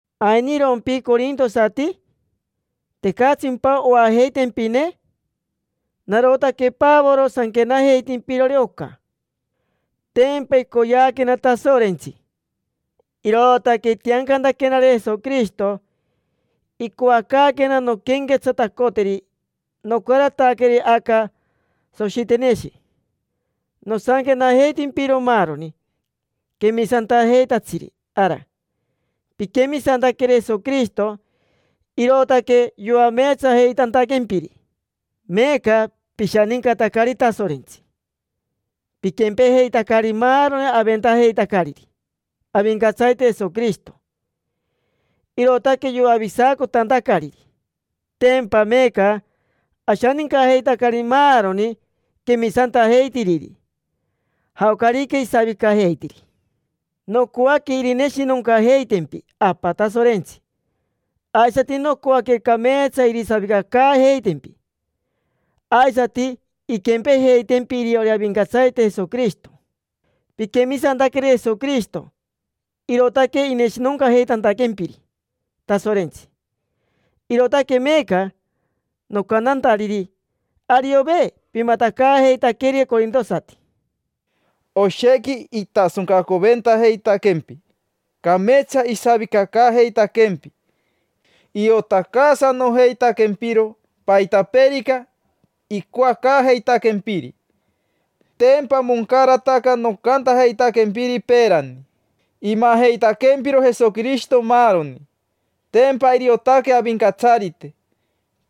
¿Ainirompi, corintosati? ¿Tecatsimpa oajeitempine? Narotaque Pavoro sanquenajeitimpirori oca. Tempa icoyeaquena Tasorentsi, irootaque itiancantaquenari Jesoquirishito, icoacaaquena nonquenquetsatacoteri. Nocarataqueri aca Soshiteneshi nosanquenajeitimpiro maaroni quemisantajeitatsiri ara. Piquemisantaqueri Jesoquirishito, irootaque yoameetsajeitantaquempiri; meeca pishanincatacari Tasorentsi. Piquempejeitacari maaroni aventajeitacariri Avincatsarite Jesoquirishito, irootaque yoavisacotantacariri. Tempa meeca ashanincajeitacari maaroni quemisantajeitiriri, jaocarica isavicajeitiri. Nocoaque irineshinoncajeitempi Apa Tasorentsi, aisati nocoaque cameetsa irisavicacaajeitempi. Aisati inquempejeitempi iriori Avincatsarite Jesoquirishito. Piquemisantaqueri Jesoquirishito, irootaque ineshinoncajeitantaquempiri Tasorentsi, irootaque meeca nocantantariri: “Ariove pimatacaajeitaqueri corintosati”. Oshequi itasoncacoventajeitaquempi, cameetsa isavicacaajeitaquempi, iotacaasanojeitaquempiro paitapeerica icoacaajeitaquempiri. Tempa moncarataca nocantajeitaquempiri peerani: imajeitaquempiro Jesoquirishito maaroni. Tempa iriotaque Avincatsarite: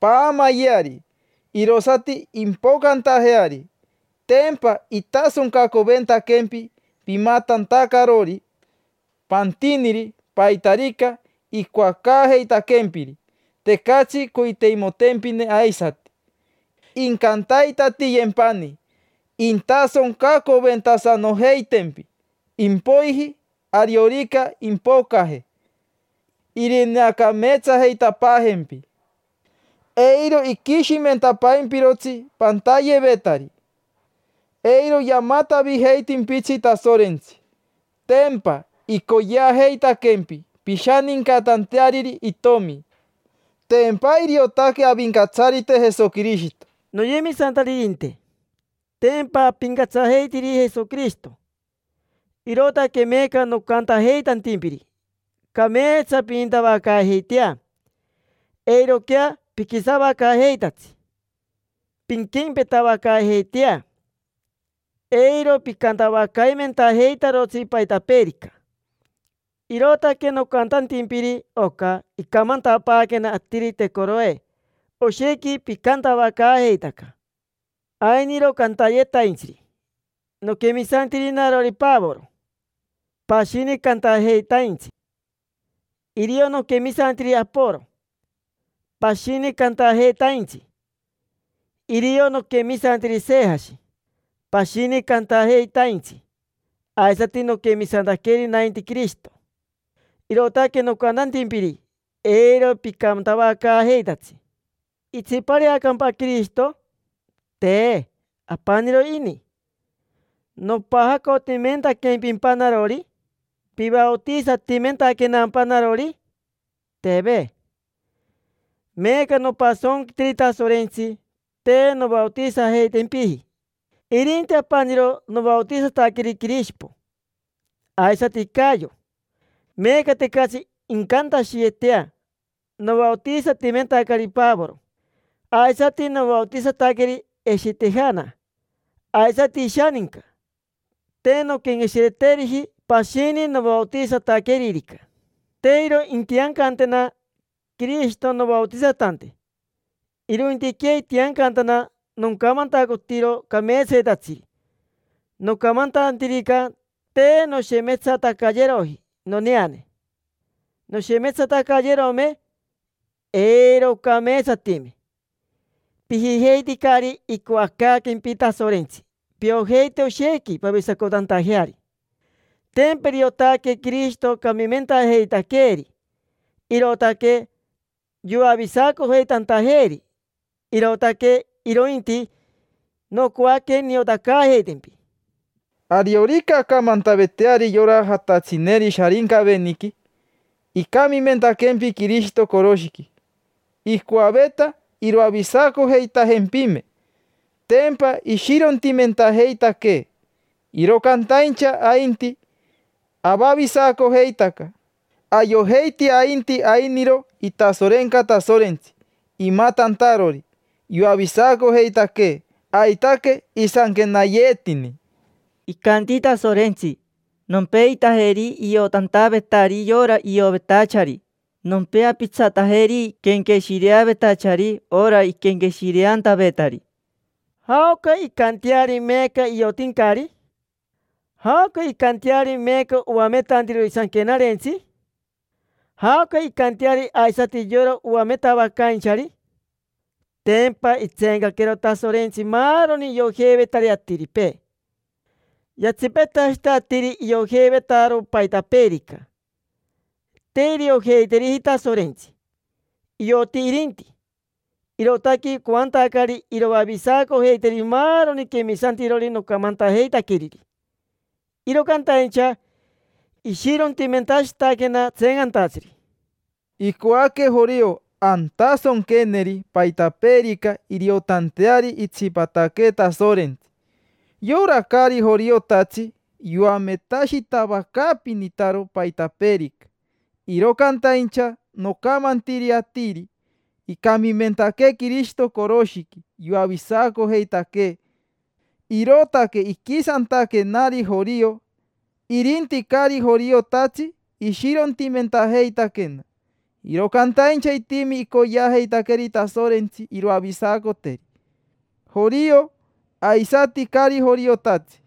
paamayeari, irosati impocantajeari. Tempa itasoncacoventaquempi pimatantacarori pantiniri paitarica icoacaajeitaquempiri, tecatsi coiteimotempine aisati. Incantaitatiyempani intasoncacoventasanojeitempi; impoiji, ariorica impocaje, irineacameetsajeitapaajempi. Eiro iquishimentapaimpirotsi pantayevetari. Eiro yamatavijeitimpitsi Tasorentsi, tempa icoyeajeitaquempi pishanincatanteariri Itomi: tempa iriotaque Avincatsarite Jesoquirishito. Noyemisantaririnte, tempa apincatsajeitiri Jesoquirishito. Irootaque meeca nocantajeitantimpiri cameetsa pinintavacaajeitea, eiroquea piquisavacaajeitatsi. Pinquempetavacaajeitea, eiro picantavacaimentajeitarotsi paitapeerica. Irootaque nocantantimpiri oca icamantapaaquena atirite Coroe oshequi picantavacaajeitaca. Ainiro cantayetaintsiri: “Noquemisantiri narori Pavoro”. Pashini cantajeitaintsi: “Irio noquemisantiri Aporo”. Pashini cantajeitaintsi: “Irio noquemisantiri Sejashi”. Pashini cantajeitaintsi aisati: “Noquemisantaqueri nainti Quirishito”. Irootaque nocantantimpiri: “Eiro picantavacaajeitatsi”. ¿Itsipareacampa Quirishito? Te, apaniro ini. ¿Nopajacotimentaquempimpa narori? ¿Pivaotisatimentaquenampa narori? Teve. Meeca nopasonquitiri Tasorentsi te novaotisajeitempiji. Irinti apaniro novaotisataqueri Quirishipo, aisati Cayo. Meeca tecatsi incantashiyeetea: “Novaotisatimentacari Pavoro”. Aisati novaotisataqueri Eshitejana, aisati ishaninca. Te nonquenqueshireteriji pashini novaotisataqueririca. Te iro intiancantena Quirishito novaotisatante, irointiquea itiancantana nocamantacotiro cameetsatatsiri. Nocamantantirica, te noshemetsatacayeroji noneane. Noshemetsatacayerome, eiro ocameetsatime. Pijijeiticari icoacaaquempi Tasorentsi piojeite oshequi pavisacotantajeari. Tempa iriotaque Quirishito camimentajeitaqueeri, irootaque yoavisacojeitantajeeri: irootaque irointi nocoaque niotacaajeitempi. Ariorica acamantavetari yora jatatsineri Sharincaveniqui: “Icamimentaquempi Quirishito coroshiqui, icoaveta iroavisacojeitajempime”, tempa ishirontimentajeitaquee. Iro cantaincha ainti, avavisacojeitaca, ayojeiti ainti ainiro itasorenca Tasorentsi imatantarori yoavisacojeitaquee. Aitaque isanquenayeetini: “Icanti Tasorentsi: ‘Nompeitajeri iotantavetari yora ioyevetachari. Nompeapitsatajeri quenqueshireavetachari ora iquenqueshireantavetari’”. ¿Jaoca incanteari meeca iotincari? ¿Jaoca incanteari meeca oametantirori Sanquenarentsi? ¿Jaoca incanteari aisati yora oametavacainchari? Tempa itseencaquero Tasorentsi maaroni iojeivetari atiripee. Yatsipetashita atiri iojeivetaro paitapeerica: te iriojeiteriji Tasorentsi. Ioti irinti, irootaque icoantacari iroavisacojeiteri maaroni quemisantirori nocamantajeitaqueriri. Iro cantaincha ishirontimentashitaquena tseencantatsiri. Icoaque jorio antasonqueneri paitapeerica iriotanteari itsipataquee Tasorentsi. Yora caari joriotatsi yoametashitavacaapinitaro paitapeerica. Iro cantaincha nocamantiri atiri: “Icamimentaquee Quirishito coroshiqui yoavisacojeitaquee”, irootaque iquisantaquenari jorio. Irinti caari joriotatsi, ishirontimentajeitaquena. Iro cantaincha itimi icoyeajeitaqueri Tasorentsi iroavisacoteri: jorio, aisati caari joriotatsi.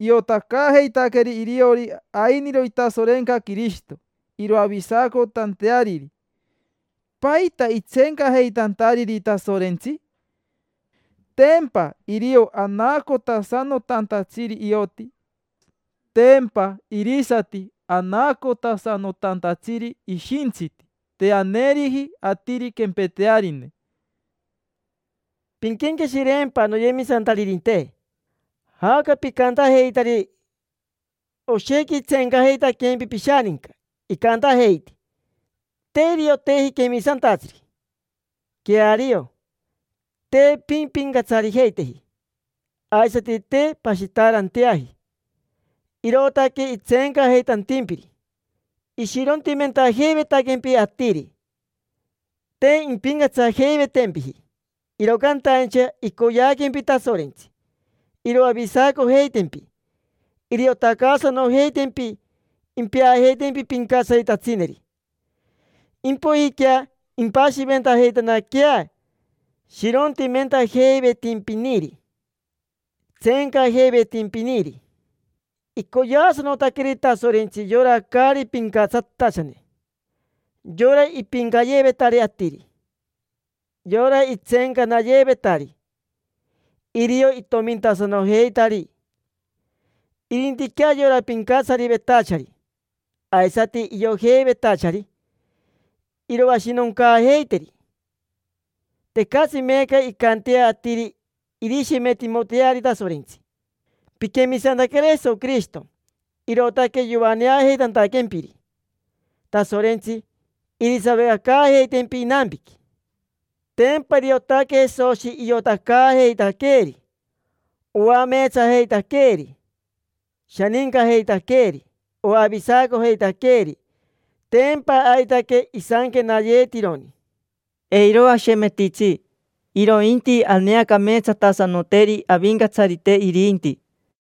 Iotacaajeitaqueri iriori ainiro itasorenca Quirishito, iroavisacotanteariri. ¿Paita itseencajeitantariri Tasorentsi? Tempa irio anaacotasanotantatsiri ioti. Tempa irisati anaacotasanotantatsiri ishintsiti. Te aneeriji atiri quempetearine. Pinquenqueshireempa, noyemisantaririnte, jaoca picantajeitari. Oshequi itseencajeitaquempi pishaninca, icantajeiti: “Te irioteji quemisantatsiri”. Queario, te pimpincatsarijeiteji, aisati te pashitaaranteaji, irootaque itseencajeitantimpiri. Ishirontimentajeivetaquempi atiri, te impincatsajeivetempiji, iro cantaincha icoyeaquempi Tasorentsi iroavisacojeitempi. Iriotacaasanojeitempi, impeajeitempi pincatsaritatsineri. Impoijiquea impashiventajeitanaquea shirontimentajeivetimpiniri, tseencajeivetimpiniri. Icoyeasanotaqueri Tasorentsi yora caari pincatsatachane, yora ipiincayeevetari atiri, yora itseencanayeevetari: irio itomintasanojeitari. Irintiquea yora pincatsarivetachari aisati iojeivetachari iroashinoncaajeiteri. Tecatsi meeca incantea atiri irishemetimoteari Tasorentsi. Piquemisantaqueri Jesoquirishito, irootaque yoaneajeitantaquempiri Tasorentsi, irisavicacaajeitempi inampiqui. Tempa iriotaque Jesoshi iotacaajeitaqueeri, oameetsajeitaqueeri, shanincajeitaqueeri, oavisacojeitaqueeri. Tempa aitaque isanquenayeetironi: “Eiro ashemetitsi, irointi aneacameetsatasanoteri Avincatsarite irinti”.